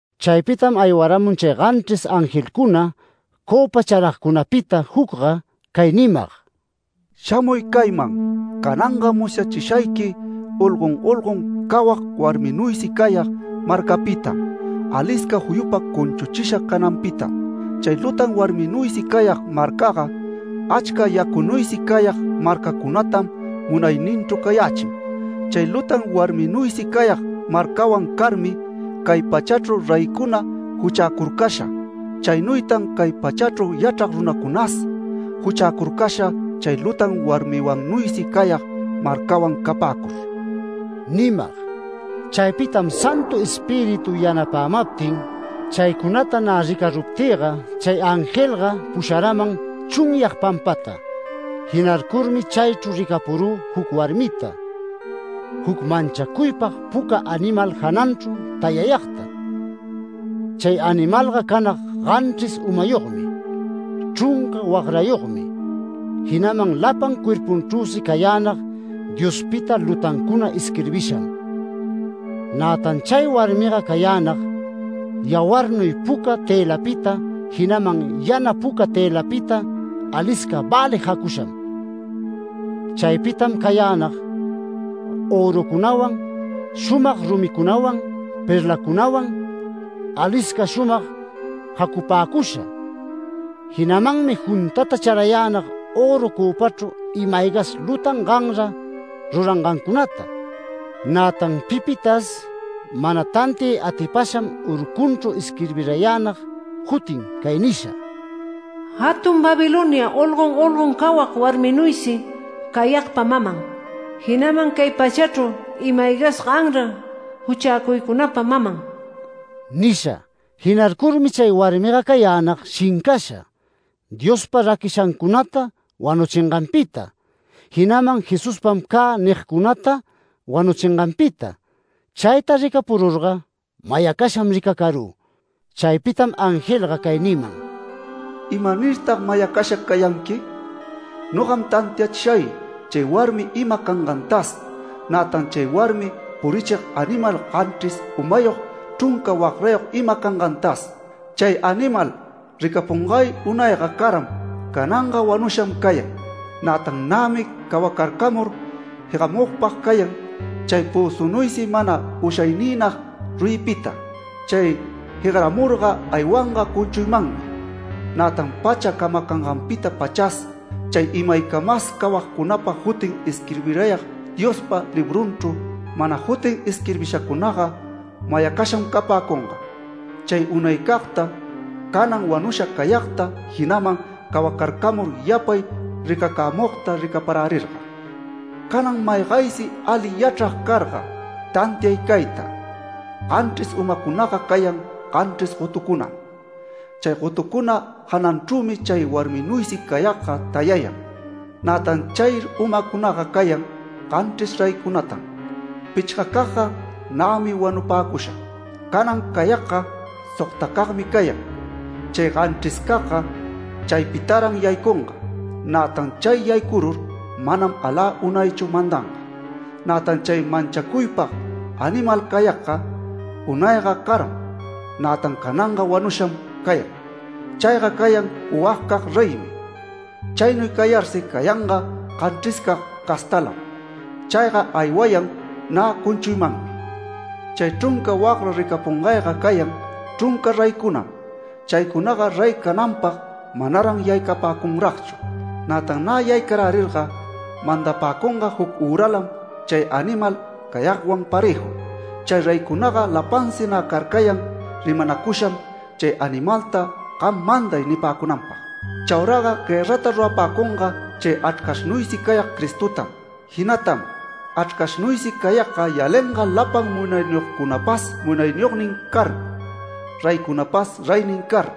Chaypitam aywaramun chay ganchris angelcuna cöpa charagcunapita jucga, cay nimag: “Shamuy cayman. Cananga musyachishayqui olgon olgon cawag warminuysi cayag marcapitam, alisca juyupa cunchuchisha cananpitam. Chay lutan warminuysi cayag marcaga, achca yacunuysi cayag marcacunatam munayninchru cayächin. Chay lutan warminuysi cayag marcawan carmi cay pachachru reycuna juchäcurcasha. Chaynuytan cay pachachru yachrag runacunas juchäcurcasha chay lutan warmiwannuysi cayag marcawan capäcur” nimag. Chaypitam Santu Espíritu yanapämaptin chaycunata nä ricaruptïga chay angelga pusharaman chunyag pampata. Jinarcurmi chaychru ricapurü juc warmita, juc manchacuypag puca animal jananchru tayayagta. Chay animalga canag ganchris umayogmi, chrunca wagrayogmi, jinaman lapan cuerpunchrüsi cayänag Diospita lutancuna isquirbisham. Nätan chay warmiga cayänag yawarnuy puca tëlapita, jinaman yana puca tëlapita alisca välig jacusham. Chaypitam cayänag örucunawan, shumag rumicunawan, perlacunawan, alisca shumag jacupäcusha. Jinamanmi juntata charayänag öru cöpachru ima-aygas lutan ganra rurangancunata. Nätan pipitas mana tantiay atipasham urcunchru isquirbirayänag jutin cay nisha: “JATUN BABILONIA, OLGON OLGON CAWAG WARMINUYSI CAYAGPA MAMAN, JINAMAN CAY PACHACHRU IMA-AYGAS GANRA JUCHÄCUYCUNAPA MAMAN” nisha. Jinarcurmi chay warmiga cayänag shincasha, Diospa raquishancunata wanuchinganpita, jinaman “Jesuspam cä” nigcunata wanuchinganpita. Chayta ricapururga mayacasham ricacarü. Chaypitam angelga cay niman: “¿Imanirtag mayacasha cayanqui? Nogam tantiachishay chay warmi ima cangantas, nätan chay warmi purichig animal, ganchris umayog, chrunca wagrayog ima cangantas. Chay animal ricapungay unayga caram, cananga wanusham cayan, nätan nämi cawacarcamur jegamugpag cayan chay pözunuysi mana ushayniynag ruyipita. Chay jegaramurga aywanga cunchuymanmi. Nätan pacha camacanganpita-pachas chay imaycamas cawayagcunapa jutin isquirbirayag Diospa librunchru, mana jutin isquirbishacunaga, mayacasham capäcunga, chay unaycagta, canan wanusha cayagta, jinaman cawacarcamur yapay ricacämugta ricaparärirga. Canan maygaysi ali yachrag carga, tantiay cayta: Ganchris umacunaga cayan ganchris gotucunam. Chay gotucuna jananchrümi chay warminuysi cayagga tayayan. Nätan chay umacunaga cayan ganchris reycunatan. Pichgacagga, nämi wanupäcusha. Canan cayagga sogtacagmi cayan. Chay ganchriscagga chaypitaran yaycunga, nätan chay yaycurur manam alä unaychu mandanga. Nätan chay manchacuypag animal cayagga, unayga caram, nätan cananga wanusham cayan. Chayga cayan puwagcag reymi. Chaynuy cayarsi cayanga ganchriscag castalam. Chayga aywayan nä cunchuymanmi. Chay chrunca wagra ricapungayga cayan chrunca reycunam. Chaycunaga rey cananpag manaran yaycapäcunragchu. Nätan nä yaycarärirga mandapäcunga juc üralam chay animal cayagwan parëju. Chay reycunaga lapansi nä carcayan rimanacusham chay animalta ‘Gam manday’ nipäcunanpag. Chauraga guërrata rurapäcunga chay Achrcashnuysi cayag Cristotam. Jinatam Achrcashnuysi cayagga yalinga lapan munayniyogcunapas munayniyognin car, reycunapas reynin car.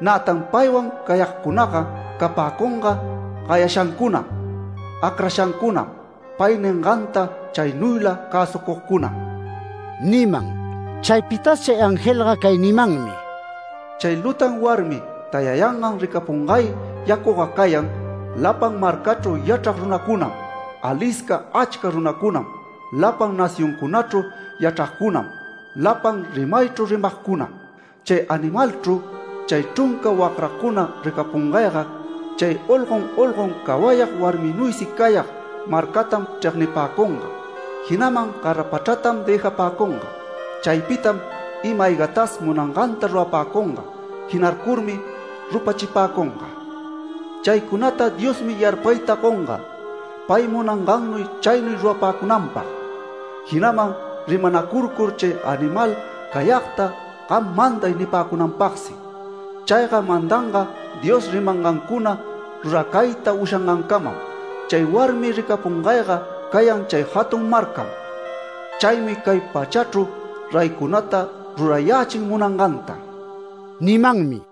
Nätan paywan cayagcunaga capäcunga gayashancunam, acrashancunam, pay ninganta chaynuyla cäsucugcunam” niman. Chaypitas chay angelga cay nimanmi: “Chay lutan warmi tayayangan ricapungay yacuga cayan, lapan marcachru yachrag runacunam, alisca achca runacunam, lapan nacioncunachru yachragcunam, lapan rimaychru rimagcunam. Chay animalchru, chay chrunca wagracuna ricapungayga, chay olgon olgon cawayag warminuysi cayag marcatam chregnipäcunga. Jinaman garapachratam dëjapäcunga. Chaypitam ima-aygatas munanganta rurapäcunga jinarcurmi rupachipäcunga. Chaycunata Diosmi yarpayta gonga, pay munangannuy chaynuy rurapäcunanpag, jinaman rimanacurcur chay animal cayagta ‘Gam manday’ nipäcunanpagsi. Chayga mandanga Dios rimangancuna ruracayta ushacangancamam. Chay warmi ricapungayga cayan chay jatun marcam. Chaymi cay pachachru reycunata rurayächin munanganta” nimanmi.